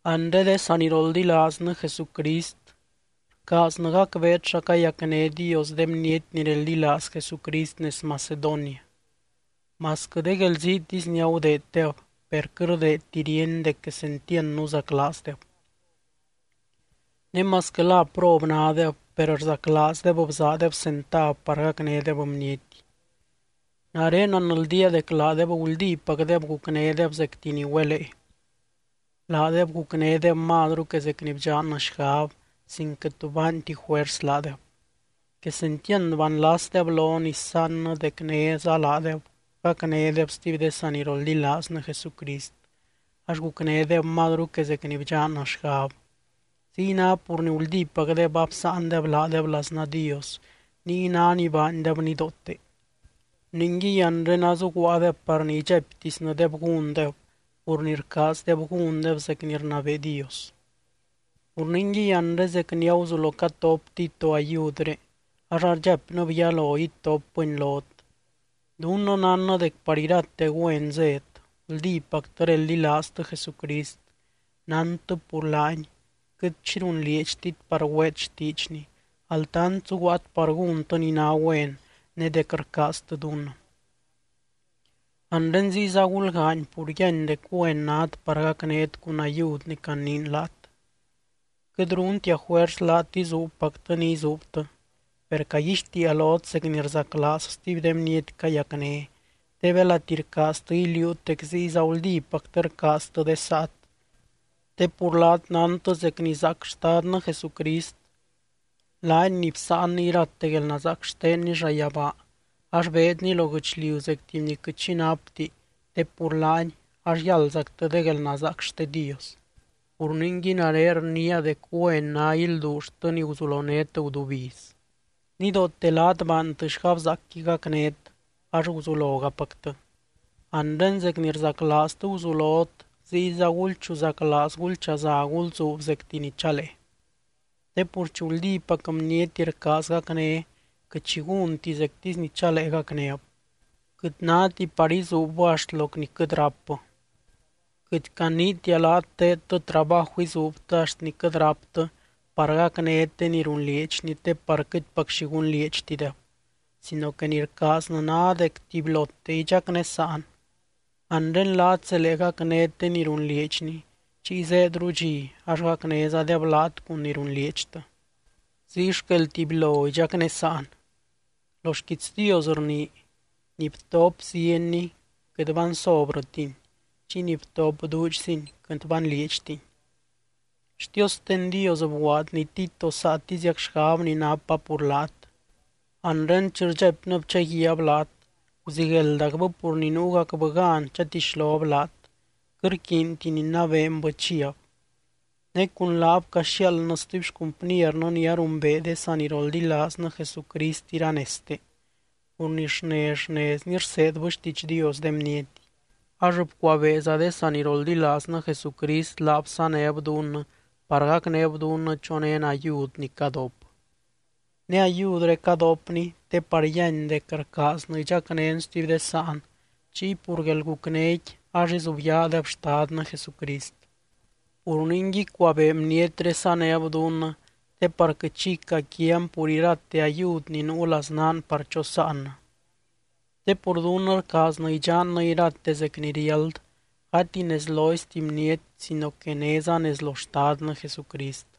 Anre de saniroldilaaznɨ Jesucrist, rcaaznɨ gacbeet xa cayacné Dios de bniety ni reldilaaz Jesucrist nez Macedonia. Masquɨ de guelziitisy ni agudeeddeb, per quɨt rdeedti ríeny dec quesentiand nuzaclaazdeb. Ne masquɨ la prob nádeb, per rzaclaazdeb bzaadeb centav par gacnédeb bniety. Nare nanldía dec laadeb guldípacdeb gucnédeb zecti ni güelee. Laadeb gucnédeb mazru que zec ni bdxannɨ xgab, sin quɨt tu baanti juers laadeb. Quesentiand banlasdeb lon isaannɨ dec néza laadeb gacnédeb stuby de saniroldilaaznɨ Jesucrist, ax gucnédeb mazru que zec ni bdxannɨ xgab. Ziy ná pur ni guldípacdeb absáandeb laadeb laznaa Dios, niy ná ni baandeb nidoote. Ningui anre azuguaadeb par ni idxaiptisnɨdeb gúndeb pur ni rcaazdeb gúndeb zec ni rnabee Dios. Pur ningui anre zec ni aguzulo catop Tito ayudré, ax ardxaipnɨb yalo itopbɨni lot. Dunnɨ nánnɨ dec par irate güen zét: Guldípactɨ reldilaaztɨ Jesucrist, nántɨ pur laany, quɨt xi runlieedxtit par güeet xtiidxny, altant zuguaat par gúntɨ ni ná güen ne dec rcaaztɨ dunnɨ. Anre ziyza gulgaany pur yíany dec güen nát par gacnét cun ayud ni caniin laat. Quɨt runtia juers laat izuubpactɨ xi izuubtɨ, per caguixtiia lot zec ni rzaclaaz stuby de bniety cayacné, te belati rcaaztɨ iliuut dec ziyza guldípactɨ rcaaztɨ de saat. Te pur laat nántɨ zec ni zaac Xtadnɨ Jesucrist, laany ni bsáanny irate guelnazaac xtenny llayabaa, ax beedny lo guɨchliu zec tuby ni quɨt xi napti te pur laany, ax yáldzactɨ de guelnazaac xte Dios. Pur ningui nare rniia dec güen ná ilduulltɨ ni guzulonét gudubiz. Nidoote laat baantɨ xgabzaacqui gacnét, ax guzulogapactɨ. Anre zec ni rzaclaaztɨ guzulot, ziyza gulchuzaclaaz gulchaza gulzuub zecti ni chalee. Te pur chi guldípac bniety rcaaz gacné, quɨt xi gúnti zectisy ni chalee gacnéb. Quɨt náti par izuubbɨ axt loc ni quɨt rápbɨ. Quɨt caniitia laat teedtɨ trabaju izuubtɨ axt ni quɨt ráptɨ par gacnét de ni runlieedxni te par quɨtpac xi gunlieedxtideb, sino que ni rcaaznɨ ná dec tubylote idxacnésaan. Anre laat zelee gacnét de ni runlieedxni, chiy zéedru dxi ax gacnézadeb laat cun ni runlieedxtɨ. Ziy xquel tubylo idxacnésaan. Lo xquiits Dios rnii: “Ni btop zienni quɨt bansobrɨtini, chiy ni btop duudxzini quɨt banlieedxtini.” Xtiosten Dios bguaadny Tito saatiziac xgab ni napa pur laat. Anre chi rdxaipnɨb chaguiaab laat, guzigueldacbɨ pur ni nuugacbɨ gan chatixlob laat, quɨt rquiinti ninabeenbɨ chiab. Ne cun laab caxiaaldnɨ stuby xcumpniernɨ ni arumbee de saniroldilaaznɨ Jesucrist iranezte, pur ni xnez xnezni rseedbɨ xtiidx Dios de bniety. Ax bcuabeeza de saniroldilaaznɨ Jesucrist laab sanéb dunnɨ par gacnéb dunnɨ chonén ayud ni cadop. Ne ayudré cadopni te par yíany dec rcaaznɨ idxacnén stuby de sáan, chiy pur guelgucnéqui ax izubyaadeb Xtadnɨ Jesucrist. Pur ningui cuabee bnietré sanéb dunnɨ te par quɨt xi icaquian pur irate ayud ni nuu laznaan par chosáannɨ. Te pur dunnɨ rcaaznɨ idxannɨ irate zec ni riáld, gati nez loizti bniety sino que néza nez lo Xtadnɨ Jesucrist.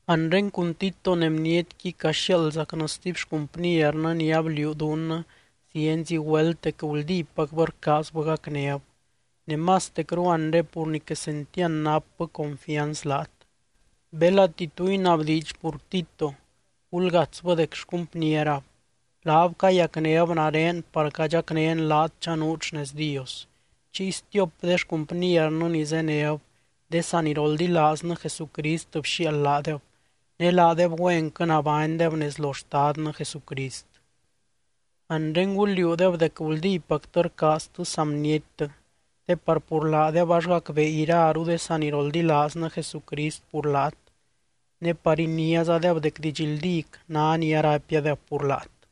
Anre cun Tito ne bnietqui caxiaaldzacnɨ stuby xcumpniernɨ ni abliuu dunnɨ zienzi güelt dec guldípacbɨ rcaazbɨ gacnéb, ne mastecru anre pur ni quesentiand napbɨ confianz laat. Belati tu inabdiidx pur Tito, gulgatsbɨ dec xcumpnierab, laab cayacnéb nare par cadxacnén laat chanuut xnez Dios. Chiy stiop de xcumpniernɨ ni zéneb, de saniroldilaaznɨ Jesucrist bxiaald laadeb, ne laadeb güenquɨ nabánydeb nez lo Xtadnɨ Jesucrist. Anre gul liuudeb dec guldípactɨ rcaaztɨ saa bniettɨ, te par pur laadeb ax gacbee iraru de saniroldilaaznɨ Jesucrist pur laat, ne par iniázadeb dec didxldíc ná ni araipiadeb pur laat.